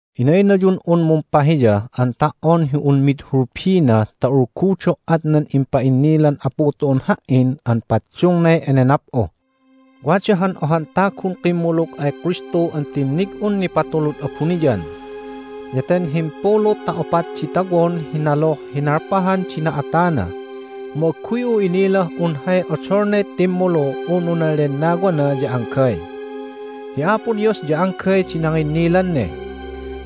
Inaynayun'un mumpahiya an ta"on hi un mid hulbina ta ulgudo"at nan impa'innilan Apu tu'un ha"in an paddungnay enenap'u. Wada han ohan tagun kimmulug ay Kristu an tinnig'un nipatulud abuniyan. Ya ten himpulu ta opat di tawon hi naluh hi nalpahan di na'atana, mu agguy'u inilah un hay odolnay timmulu unu nan lennawana ya anggay. Hi Apo Dios ya anggay di nanginnilan ne.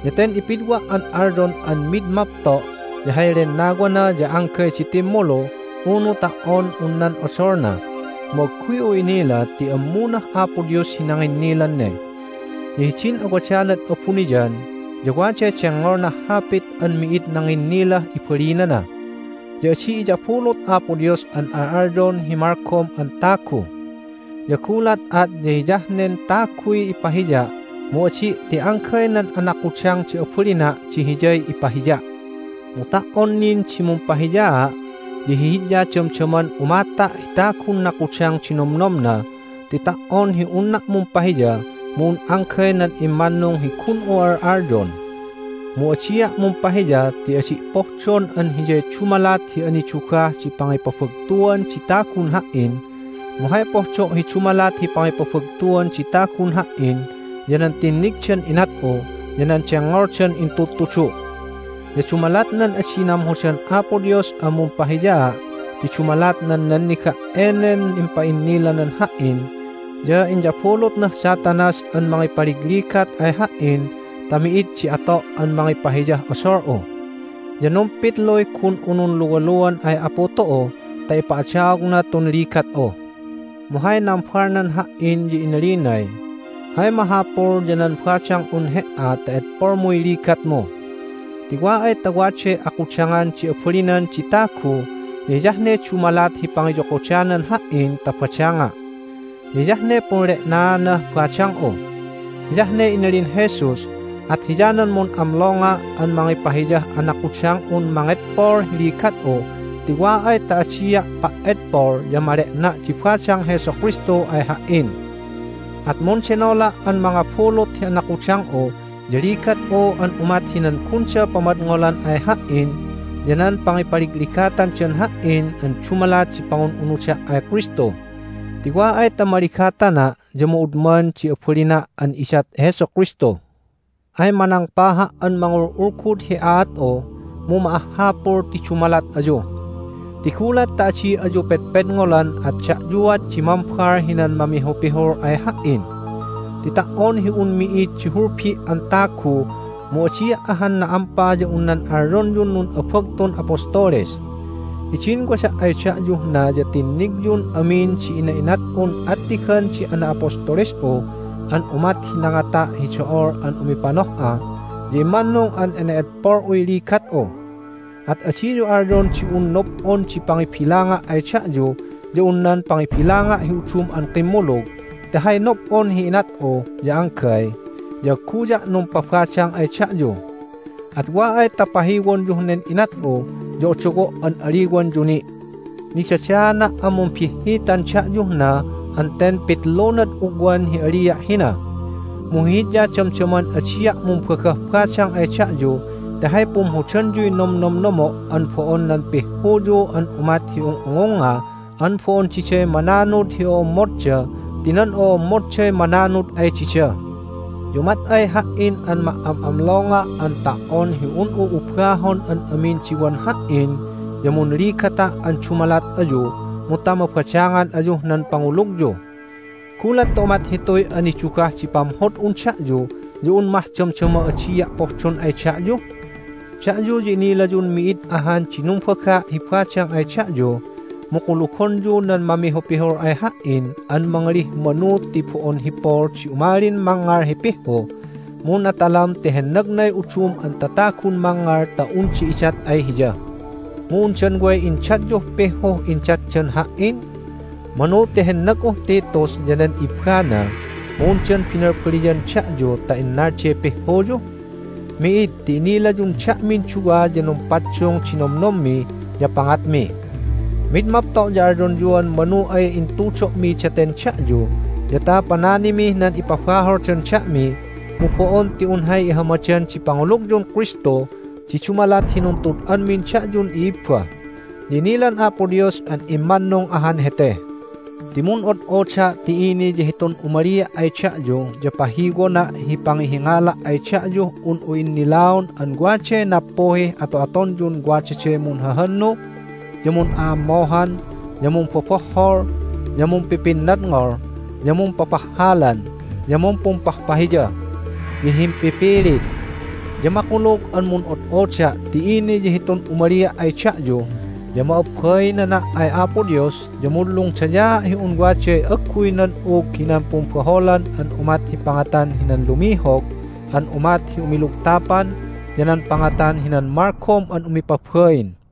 Ya ten ipidwa' an alyon an mid mapto' ya hay lennawana ya anggay di timmulu unu ta"on un nan odolna, mu agguy'u inila ti ammunah Apo Dios hi nanginnilan ne. Ya hidin awadanad abuniyan ya waday dengngolnah hapit an mi'id nanginnilah ibalinana, ya adi iyabulut Apo Dios an al'alyon hi malgom an tagu. Ya gulat at ya hiyah nen taguy ipahiya' mu adi' ti anggay nan anakudang di abalina' di hiyay ipahiya'. Mu ta"on nin di mumpahiyaa', ya hihidya damdaman umata' hi tagun nakudang di nomnomna ti ta"on hi unna' mumpahiya mu un anggay nan immannung hi gun'u al'alyon. Mu adia' mumpahiya ti adi' pohdon an hiyay dumalat hi anidugah di pangipabagtuan di tagun ha"in, mu hay pohdo' hi dumalat hi pangipabagtuan di tagun ha"in ya nan tinnigdan inat'u ya nan dengngoldan intudtudu'. Ya dumalat nan adi namhodan Apo Dios an mumpahiyaa' ti dumalat nan nanniga' enen impa'innilanan ha"in ya inyabulutnah Satanas an mangipaligligat ay ha"in ta mi'id di ato' an mangipahiyah odol'u. Ya numpitluy gun'u nunluwaluan ay Apu tu'u ta ipa'adaogna tun ligat'u. Mu hay nambalnan ha"in ya inalinay, "Hay mahapul ya nan badang'un he"a ta edpolmuy ligatmu. Ti wa ay ta waday akudangan di abalinan di tagu ya hiyah ne dumalat hi pangiyokodanan Ha"in ta badanga', ya hiyah ne punle'naanah badang'u." Hiyah ne inalin Jesus, at hiyanan mun'amlonga' an mangipahiyah anakudang'un mangedpol hi ligat'u ti wa ay ta adia' pa"edpol ya male'na' di badang Jesu Kristu ay ha"in. At mundenola' an mangabulut hi anakudang'u ya ligat'u an umat hinan gunda pamadngolan ay ha"in ya nan pangipaligligatandan ha"in an dumalat di pangun'unuda' ay Kristu. Ti wa ay ta maligatana' ya ma'udman di abalina' an idat Jesu Kristu. Ay manangpaha' an mangul'ulgud hi aat'u, mu ma'ahhapul ti dumalat ayu. Ti gulat ta adi ayu pedpedngolan at da'yuat di mambal hinan mamihupihul ay ha"in. Ti ta"on hi un mi'id di hulbi' an tagu mu adia' ahan na'ampa ya un nan alyonyun nun'abagtun apostoles. Hidin wada' ay da'yuh na ya tinnigyun amin di ina'inat'un attigan di ana'apostoles'u an umat hi nangata' hi do'ol an umipanoh'a, ya immannung an ene'edpol'uy ligat'u. At adiyu alyon di un nob'on di pangibilanga' ay da'yu ya un nan pangibilanga' hi udum an kimmulug ti hay nob'on hi inat'u ya anggay, ya agguya' numpabadang ay da'yu. At wa ay ta pahiwonyuh nen inat'u ya odowo' an aliwanyu ni'! Nidadaana' an mumbihhitan da'yuh na an ten pitlunad ugwan hi alia' hina. Mu hihidya damdaman adia' mumbagah badang ay da'yu ti hay pumhodanyuy nomnomnomo' an bo'on nan pihhuyu an umat hi ung'ungungnga an bo'on diday mananud hi o'ommodda ti nan o'ommodday mananud ay dida. Ya umat ay ha"in an ma"am'amlonga' an ta"on hi un'u ubahon an amin di wan ha"in ya munligata' an dumalat ayu mu ta mabadangan ayuh nan pangulugyu. Gulat ta umat hituy anidugah di pamhod'un da'yu ya un mah damdama adia' pohdon ay da'yu? Da'yu ya inilayun mi'id ahan di numbaga' hi badang ay da'yu, mu kulugonyu nan mamihupihul ay ha"in an mangalih manu ti bo'on hi Paul di umalin mangngal hi pihhu, mu natalam ti hennagnay udum an tatagun mangngal ta unda idat ay hiya. Mu undan way indatyuh pihhuh indatdan ha"in? Manu ti hennag'uh Titus ya nan ibbana, mu undan binalbaliyan da'yu ta innalday pihhuyu? Mi'id, ti inilayun da'min duwa ya numpaddung di nomnommi ya pangatmi. Mid mapto' ya alyonyuan manu ay intudo'mi daten da'yu ya ta pananimih nan ipabaholdan da'mi, mu bo'on ti un hay ihamadan di pangulugyun Kristu di dumalat hi nuntud'anmin da'yun i'ibba. Ya inilan Apo Dios an immannung ahan hete. Ti mun'od'oda' ti ini ya hitun umalia' ay da'yu ya pahiwona' hi pangihingala' ay da'yuh un'u innilaon an waday nappuhih ato'atonyun wadaday munhahannu, ya mun'a'ammohan, ya mumbobohhol, ya mumpipinnadngol, ya mumpapahhalan, ya mumpumpahpahiya, ya himpipilit. Ya makulug an mun'od'oda' ti ini ya hitun umalia' ay da'yu ya ma'abbainana' ay Apo Dios ya munlungdayaa' hi un waday agguy nan'ug hinan pumbaholan an umat hi pangatan hinan lumihog an umat hi umilugtapan ya nan pangatan hinan malgom an umipabain.